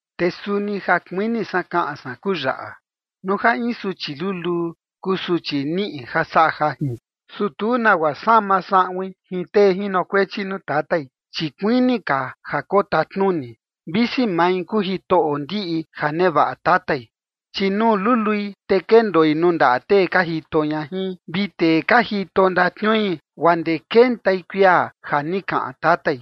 Te suni ja kuini san kaꞌan san kuu yaꞌa: Nuu ja in suchi luluu kuu suchi niꞌi ja saꞌa jajin, su tu nagua sama saꞌuin jin tee jinokuechi nuu tatai, chi kuini ka ja kotatnuni, visi mai kuu jitoꞌo ndiꞌi ja nevaꞌa tatai. Chi nuu lului, te kendoi nuu ndaꞌa tee ka jito ña jin vi tee ka jito ndatniui guaa ndee kentai kuia ja ni kaꞌan tatai.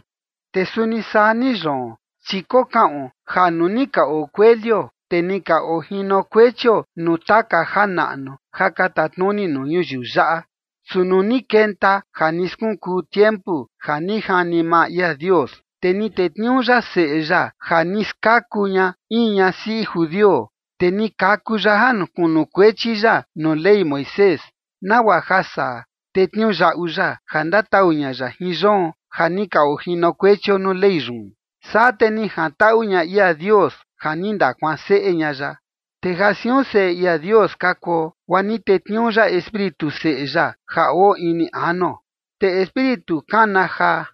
Te suni saa ni yoon. Chi kokaꞌon ja nuu ni ka oo kuelio, te ni ka ojinokuechio nuu taka janaꞌnu ja ka tatnuni nuu ñuyiu yaꞌa. Su nuu ni kenta ja ni skunkuu tiempu ja ni jani maa ia Dios, te ni tetniuu ya Seꞌe ya ja ni skaku ña in ñasiꞌi judio, te ni kaku ya ja kunukuechi ya nuu Ley Moisés, nagua ja saa, te tniuyaꞌu ya ja ndatau ña ya jin yoon ja ni ka ojinokuechio nuu Ley yun, saa te ni jantaꞌu ña ia Dios ja ni ndakuanseꞌe ña ya. Te ja siun seꞌe ia Dios ka kuo, guaa ni tetniuu ya Espíritu Seꞌe ya ja oo ini anuo, te Espíritu kana jaa: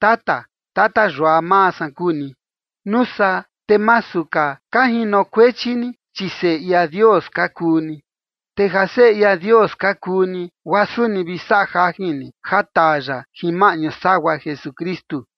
“¡Tata, tata yua maa san kuu ni!” Nuu saa, te masu ka ka jinokuechi ni, chi seꞌe ia Dios ka kuu ni. Te ja seꞌe ia Dios ka kuu ni, guaa suni vi saꞌa jajin ni ja taa ya jin maꞌñu sagua Jesukristu.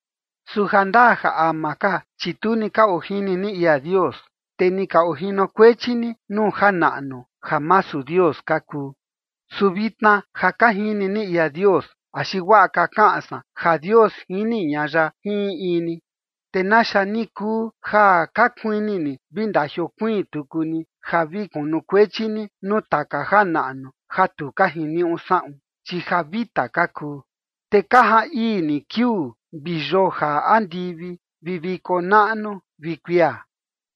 Su jandaa ja ama ka, chi tu ni ka ojini ni ia Dios, te ni ka ojinokuechi ni nuu janaꞌnu ja masu Dios ka kuu. Su vitna ja ka jini ni ia Dios axi guaꞌa ka kaꞌan san ja Dios jini ña ya jin in in ni, ¿te naxa ni kuu ja ka kuini ni vi ndajiokuiin tuku ni ja vi kunukuechi ni nuu taka janaꞌnu ja tu ka jiniuꞌu saꞌun, chi ja vita ka kuu? Te ka jaan ii ni kiuu, vi yoo jaa andivi, vi viko naꞌnu, vi kuia.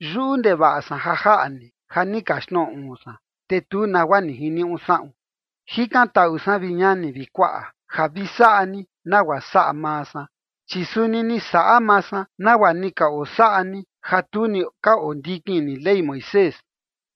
Yuꞌu ndevaꞌa san ja jaꞌa ni, ja ni kaxtnoꞌo uun san, te tu nagua ni jiniuꞌu saꞌun. Jikantaꞌu san, vi ñani vi kuaꞌa, ja vi saꞌa ni nagua saꞌa maa san, chi suni ni saꞌa maa san nagua ni ka osaꞌa ni ja tu ni ka ondikin ni Ley Moisés.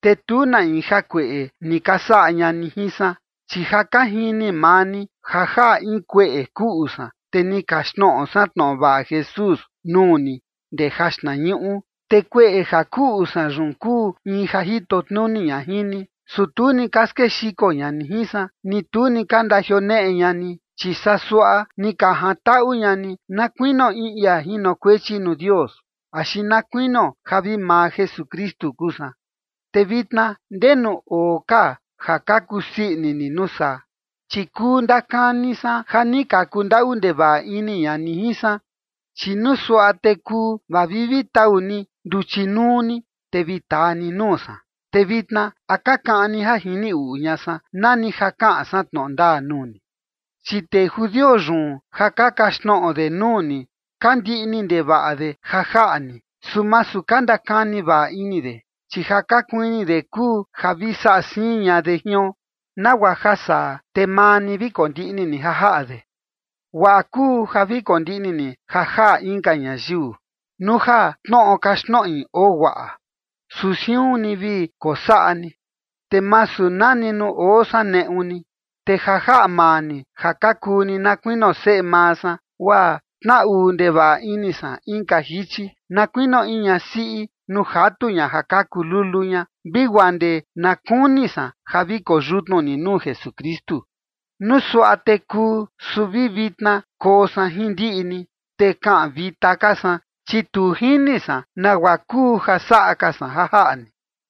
Te tu na in jakueꞌe ni ka saꞌa ña ni jin san. Chi ja ka jini maa ni ja jaꞌa in kueꞌe kuꞌu san, te ni kaxtnoꞌo san tnoꞌo vaꞌa Jesús nuu ni ndee jaxtnañuꞌu. Te kueꞌe ja kuꞌu san yun kuu in ja jito tnuni ña jin ni, su tu ni ka skexiko ña ni jin san, ni tu ni ka ndajioneꞌe ña ni. Chi saa suaꞌa ni ka jantaꞌu ña ni, na kuinio in ia jinokuechi nuu Dios, axi na kuinio ja vi maa Jesukristu kuu san. ¿Te vitna ndenu oo ka ja ka kusii ini ni nuu saa? Chi kuu ndakani san ja ni ka kundaꞌu ndevaꞌa ini ña ni jin san, chi nuu suaꞌa te kuu vaa vi vi tau ni nduchi nuu ni, te vi taa ni nuu san. Te vitna, ¿a ka kaꞌan ni ja jini uꞌu ña san, nani ja kaꞌan san tnoꞌo ndaa nuu ni? Chi tee judio yun ja ka kaxtnoꞌo de nuu ni ka ndiꞌni ndevaꞌa de ja jaꞌa ni, su masu ka ndakani vaꞌa ini de. Chi ja ka kuini de kuu ja vi saꞌa siin ña de jion, nagua ja saa, te maa ni vi kondiꞌni ni ja jaꞌa de. Guaꞌa kuu ja vi kondiꞌni ni ja jaꞌa inka ñayiu, nuu ja tnoꞌo kaxtnoꞌi oo guaꞌa; su siun ni vi kosaꞌa ni, te masu nani nuu oo san neꞌu ni. Te ja jaꞌa maa ni ja ka kuu ni na kuinio seꞌe maa san, guaa tnaꞌu ndevaꞌa ini san inka jichi, na kuinio in ñasiꞌi nuu jatu ña ja kaku lulu ña, vi guaa ndee na kuni san ja vi koyutnu ni nuu Jesukristu. Nuu suaꞌa te kuu, su vi vitna koo san jin ndiꞌi ni, te kaꞌan vita ka san, chi tu jini san nagua kuu ja saꞌa ka san ja jaꞌa ni.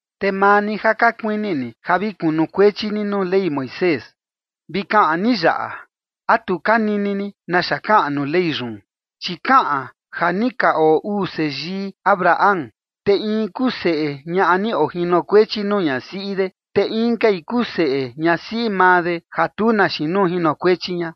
Te maa ni ja ka kuini ni ja vi kunukuechi ni nuu Ley Moisés, vi kaꞌan ni yaꞌa, ¿a tu ka nini ni naxa kaꞌan nuu Ley yun? Chi kaꞌan ja ni ka oo uu seyii Abraham, te in kuu seꞌe ñaꞌa ni ojinokuechi nuu ñasiꞌi de, te inkai kuu seꞌe ñasiꞌi maa de ja tu na xiin nuu jinokuechi ña.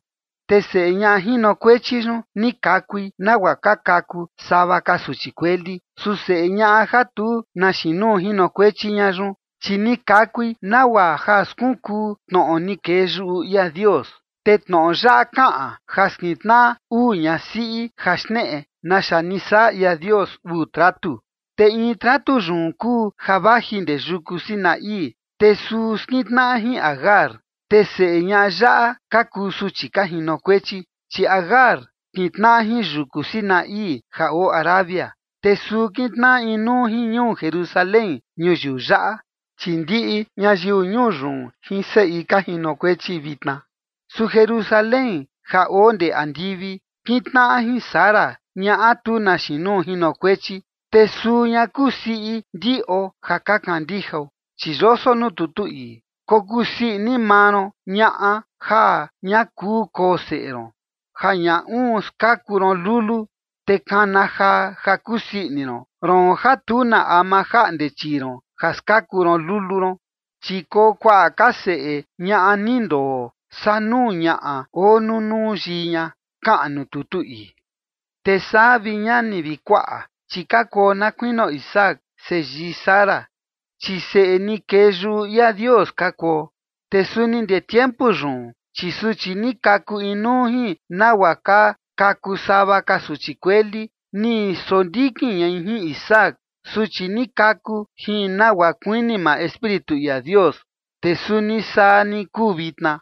Te seꞌe ñaꞌa jinokuechi yun, ni kakui nagua ka kaku sava ka suchi kueli. Su seꞌe ñaꞌa ja tu na xiin nuu jinokuechi ña yun, chi ni kakui nagua ja skunkuu tnoꞌo ni kee yuꞌu ia Dios. Te tnoꞌo yaꞌa kaꞌan ja skintnaꞌa uu ñasiꞌi ja xneꞌe naxa ni saꞌa ia Dios uu tratu. Te in tratu yun kuu ja vaji ndee yuku Sinaí, te suu skintnaꞌa jin Agar, te seꞌe ñaꞌa yaꞌa ka kuu suchi ka jinokuechi. Chi Agar kintnaꞌa jin yuku Sinaí ja oo Arabia, te suu kintnaꞌa inuu jin ñuu Jerusalén ñuyiu yaꞌa, chi ndiꞌi ñayiu ñuu yun jin seꞌi ka jinokuechi vitna. Su Jerusalén ja oo ndee andivi, kintnaꞌa jin Sara, ñaꞌa tu na xiin nuu jinokuechi, te suu ña kuu siꞌi ndiꞌo ja ka kandijao. Chi yoso nuu tutu ii: Kokusii ini maa ron, ñaꞌa ja ña kuu koo seꞌe ron, ja ña uun skaku ron lulu, te kana jaa, ja kusii ini ron, roon ja tu na ama jaꞌnde chii ron ja skaku ron lulu ron. Chi koo kuaꞌa ka seꞌe ñaꞌa ni ndoo, saa nuu ñaꞌa oo nunuu yii ña, kaꞌan nuu tutu ii. Te saa, vi ñani vi kuaꞌa, chi ka kuo na kuinio Isaac, seyii Sara, chi seꞌe ni kee yuꞌu ia Dios ka kuo. Te suni ndee tiempu yun, chi suchi ni kaku inuu jin nagua ka kaku sava ka suchi kueli, ni sondikin ñai jin Isaac, suchi ni kaku jin nagua kuini maa Espíritu ia Dios, te suni saa ni kuu vitna.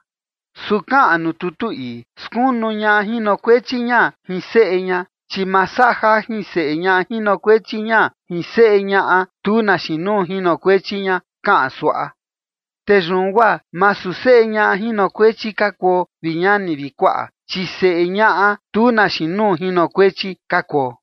Su kaꞌan nuu tutu ii: “Skunu ñaꞌa jinokuechi jian jin seꞌe ña, chi ma saꞌa jajin seꞌe ñaꞌa jinokuechi jian jin seꞌe ñaꞌa tu na xiin nuu jinokuechi ña” kaꞌan suaꞌa. Te yun guaa masu seꞌe ñaꞌa jinokuechi ka kuo, vi ñani vi kuaꞌa, chi seꞌe ñaꞌa tu na xiin nuu jinokuechi ka kuo.